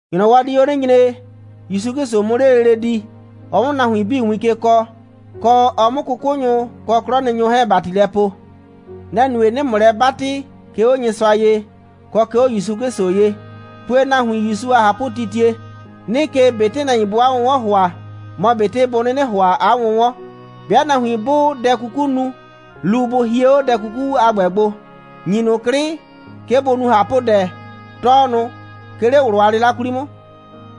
‑Nyrɔwɔ di 'o 'nɩ nyre, ‑Yusu 'Klɩsʋ 'mʋ 'le lele di, ɔ 'mʋ nahuin 'bii win ke kɔɔ, kɔ, ɔ 'mʋ 'kʋkʋnyʋ kɔ 'klɔnɩnyʋ 'hɛɛn ‑bati lɛ poo. Nɛ‑ nue, 'nɩɩ ‑mʋ lɛ 'batɩ, 'ke 'o Nyɩsʋa ye, kɔ 'ke 'o ‑Yusu 'Klɩsʋ ye, pue nahuin ‑Yusu a ꞊hapʋtitie. 'Nɩɩ ke, ꞊betɩ nahuin bʋʋ 'a 'wʋnwɔn ‑hʋa, mɔ ꞊betɩ bʋ 'nɩnɩ ‑hʋa 'a 'wʋnwɔn. 'Bɩa nahuin 'bʋʋ dɛ 'kuku nu, lu, bʋ hie 'o dɛ 'kuku a ‑gbɛ gbo, ‑nyi ꞊nʋ 'klɩ, 'ke bʋ nu ꞊hapʋdɛ. Tɔɔ ꞊nʋ, 'ke 'le ꞊wlʋ a 'lɩla 'kwli 'mʋ.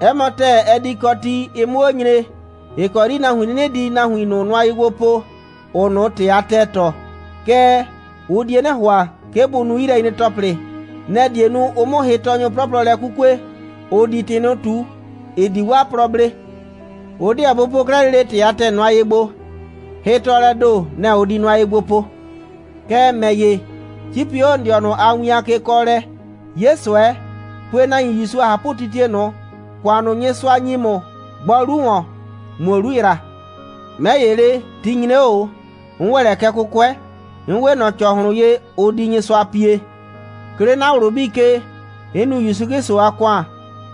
'Ɛ mɔ ‑tɛɛ, ɛ di kɔ ti, ɩ 'mʋ 'o nyre, ‑ɩ kɔ 'yri nahuin 'nɩnɩ di nahuin ꞊nʋ nʋa ye gbo po, ‑ʋʋ ꞊nʋ ‑tɩ a ‑tɛɛ tɔɔ. Kɛɛ, ʋ die 'nɩ ‑hʋa, 'ke bʋ nu 'yilɛnyre‑tɔplɩ. Nɛ‑ die nu, ʋ 'mʋ hɩtɔɔnyʋ 'plɔplɔ lɛ 'kukue, ‑ʋ di ‑tɩ ꞊nʋ ꞊tu, ‑ɩ di 'waa plɔ blee. Ʋ 'deɛ bʋ po 'klɛɛ lele ‑tɩ a ‑tɛɛ nʋa ye gbo, hɩtɔɔlɛɛ ‑do, nɛ‑ ʋ di nʋa ye gbo po. Kɛɛ, ‑mɛ ‑ye, 'cipi 'o ‑n dɩɔnʋ a win a kekɔɔlɛ, 'ye ꞊sʋɛ, pue nahuin ‑Yusu a ꞊hapʋtitie ꞊nʋ. ‑Kʋan ꞊nʋ, Nyɩsʋa ‑nyi ‑mʋ, gbɔ 'lu ‑wɔn, ꞊muo 'lu ‑yra. 'Mɛ ‑ye le, ti nyre 'o ꞊o, 'n ‑wɛ lɛ kɛ 'kʋkʋɛ. 'N 'we ꞊nɔ ‑cɔhlʋn ye, ʋ di Nyɩsʋa pie. 'Ke 'le 'na ꞊wlʋ 'bii ke, 'n nu ‑Yusu 'Klɩsʋ a ‑kʋan,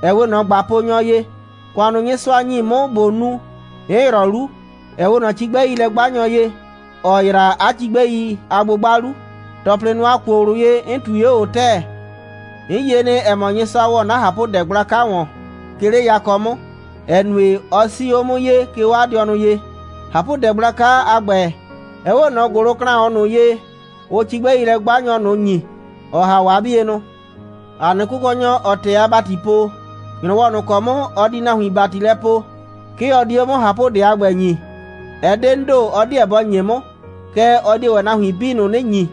‑ɛ 'we ꞊nɔ ꞊gbaponyɔ ye. ‑Kʋan ꞊nʋ, Nyɩsʋa ‑nyi 'mʋ ꞊bo nu, 'n ‑yrɔ 'lu, ‑ɛ 'we ꞊nɔ cigbɛilɛ'gbanyɔ ye, ‑ɔ ‑yra 'a cigbɛi a 'gbʋgba 'lu. ‑Tɔplɩ ꞊nʋ, ‑a kuo ꞊wlʋ ye, 'n ꞊tui 'o ꞊o ‑tɛɛ. 'N yie nɩ, ‑ɛ mɔ, Nyɩsʋa ‑wɔ 'na ꞊hapʋdɛ gblaka ‑wɔn, 'ke 'le yakɔ 'mʋ, ‑ɛ nue, ɔ 'sii 'o 'mʋ ye, 'ke 'o 'a dɩɔnʋ ye. ꞊Hapʋdɛ gblaka a ‑gbɛ, ɛ 'we ꞊nɔ ‑gʋlʋklaʋn ꞊nʋ ye, ʋʋ cigbɛilɛ'gbanyɔ ꞊nʋ ‑nyi, ‑ɔ ‑ha 'o 'a 'bienʋ. ‑A nɩ Kʋkɔnyɔ, ‑ɔɔ ‑tɛɛ a ‑bati po, ‑nyrɔwɔ ꞊nʋ ‑kɔ 'mʋ ɔ di nahuin ‑bati lɛ poo, 'ke ɔ di 'o 'mʋ ꞊hapʋdɛ a ‑gbɛ ‑nyii. Ɛ 'de 'n ‑do, ɔ 'deɛ bɔ ‑nye 'mʋ. Kɛɛ, ɔ die ‑wɛ nahuin 'bii ꞊nʋ 'nɩ ‑nyi,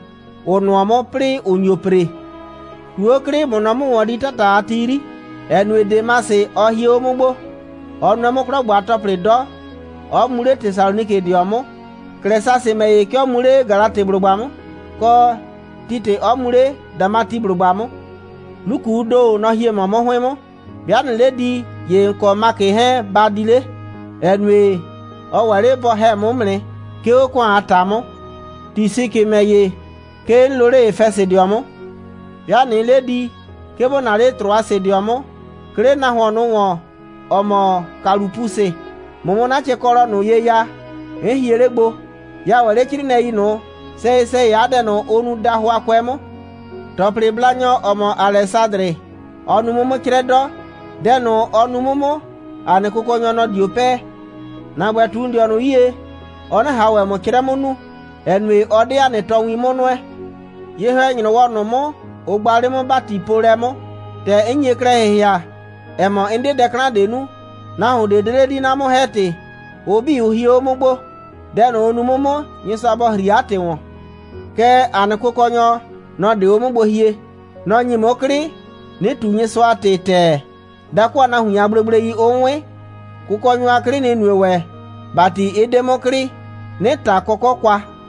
‑ʋ nʋɔ 'mʋ, 'plɩɩ ‑ʋ nyo ‑pre. ꞊Tu 'o 'klɩ, ꞊mʋ nɔ 'mʋ ‑wɔn di 'tata a ti 'yri, ‑ɛ nue, Demasɩ, ɔ hie 'o 'mʋ gbo. Ɔ nʋɛ 'mʋ 'klɔ ‑gbo a ‑tɔplɩ 'dɔ, 'ɔ mu 'le Tesalonikɩdɩɔ 'mʋ. Klɛsasɩ ‑mɛ ‑ye, 'ke ɔ mu 'le Galatɩblʋgba 'mʋ, kɔ, Titɩ 'ɔ mu 'le Damatiblʋgba 'mʋ. Lukuu ‑do, nɔ‑ nɩ mɔ 'mʋ 'hʋɩn 'mʋ. 'Bɩa ꞊nɩɩ 'le di, ‑ye ‑n kɔ Makɩ 'hɛɛn ba di 'le, ‑ɛ nue, ɔ ‑wɛ 'le bɔ ‑hɛ 'mʋ 'mʋ nɩ, 'ke 'o ‑kʋan a ‑ta 'mʋ. Tisikɩ ‑mɛ ‑ye, 'ke 'n loo 'le Efɛsɩdɩɔ 'mʋ. 'Bɩa ꞊nɩɩ 'le di, 'ke ‑bo naa 'le Trʋasɩdɩɔ 'mʋ, 'ke 'le nahuon ꞊nʋ ‑wɔn, ‑ɔ mɔ Kalʋpusɩ, ꞊mʋ 'mʋ 'na cɛkɔlɔ ꞊nʋ ye ya, 'n hie 'le gbo. Ya ‑wɛ 'le 'crɩɩnɩɛi ꞊nʋ, sɛyɩ‑sɛyɩ 'a dɛ ꞊nʋ, ʋ nuu dahʋakʋɛ 'mʋ. ‑Tɔplɩblanyɔ, ‑ɔ mɔ Alɛsadrɩ, ɔ nu 'mʋ 'mʋ 'crɛ 'dɔ. Dɛ ꞊nʋ, ɔ nu 'mʋ 'mʋ, ‑a nɩ Kʋkɔnyɔ, nɔ‑ dio 'pɛɛ. ‑Na ‑gbɛ, ꞊tu ‑n dɩɔnʋ 'yie, ɔ 'nɩ ꞊han ‑wɛ ‑mʋ 'crɛ 'mʋ nu, ‑ɛ nue, ɔ 'de ‑a nɩ tɔɔwin 'mʋ nʋɛ. Ye‑hɛ‑nyrɔwɔ ꞊nʋ 'mʋ, ʋ gba 'le 'mʋ ‑batipoolɛ 'mʋ, ‑tɛ 'n nye klɛ ‑hɩhɩa, ‑ɛ mɔ, 'n 'de dɛ 'klan ꞊de nu, nahuon ꞊de 'de 'le di, 'na 'mʋ‑hɛ‑tɩ. Ʋ 'bii, ʋ hie 'o 'mʋ gbo. Dɛ ꞊nʋ, ʋ nu 'mʋ 'mʋ, Nyɩsʋa bɔ ‑hri 'a ‑tɩ ‑wɔn. Kɛɛ, ‑a nɩ Kʋkɔnyɔ, nɔ‑ 'de 'o 'mʋ gbo hie. Nɔ‑ ‑nyi 'mʋ 'klɩ, 'nɩ ꞊tu Nyɩsʋa a ‑tɩ ‑tɛɛ, dakʋ a nahuin a gblegblei 'ʋ 'wɩn. Kʋkɔnyɔ a 'klɩ, nɩ‑ nue ‑wɛ, ‑bati 'ɩ 'de 'mʋ klɩ, 'nɩ ꞊ta kɔkɔ' kwa.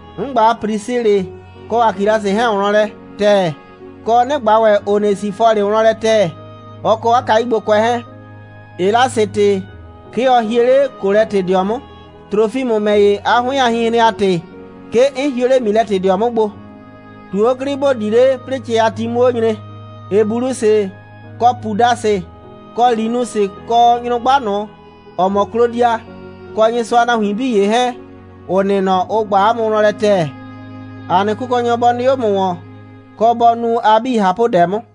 'N ꞊gba Prisilɩ kɔ Akilasɩ 'hɛɛn wlɔn lɛ ‑tɛɛ, kɔ, 'nɩ ꞊gba ‑wɛ Onesifɔlɩ wlɔn lɛ ‑tɛɛ, ɔ kɔ 'a kayugbokʋɛ 'hɛɛn. Elasɩtɩ, 'ke ɔ hie 'le Kolɛtɩdɩɔ 'mʋ. Trofimʋ ‑mɛ ‑ye, 'a 'hʋɩn a hinhren a ‑tɩ, 'ke 'n hio 'le Milɛtɩdɩɔ 'mʋ gbo. ꞊Tu 'o 'klɩ, ‑bo di 'le, 'plɩɩ cɛ a ti 'mʋ 'o nyre. Ebulusɩ, kɔ Pudasɩ, kɔ Linusɩ, kɔ nyrʋgba ꞊nʋ, ‑ɔ mɔ Klodia, kɔ Nyɩsʋa a nahuin 'bii ‑ye 'hɛɛn, ‑ʋ nɩ nɔ, ʋ ꞊gba ‑mʋ wlɔn lɛ ‑tɛɛ. ‑A nɩ Kʋkɔnyɔ bɔ 'nɩ 'o ‑mʋ ‑wɔn, kɔ, bɔ nu a 'bii ꞊hapʋdɛ 'mʋ.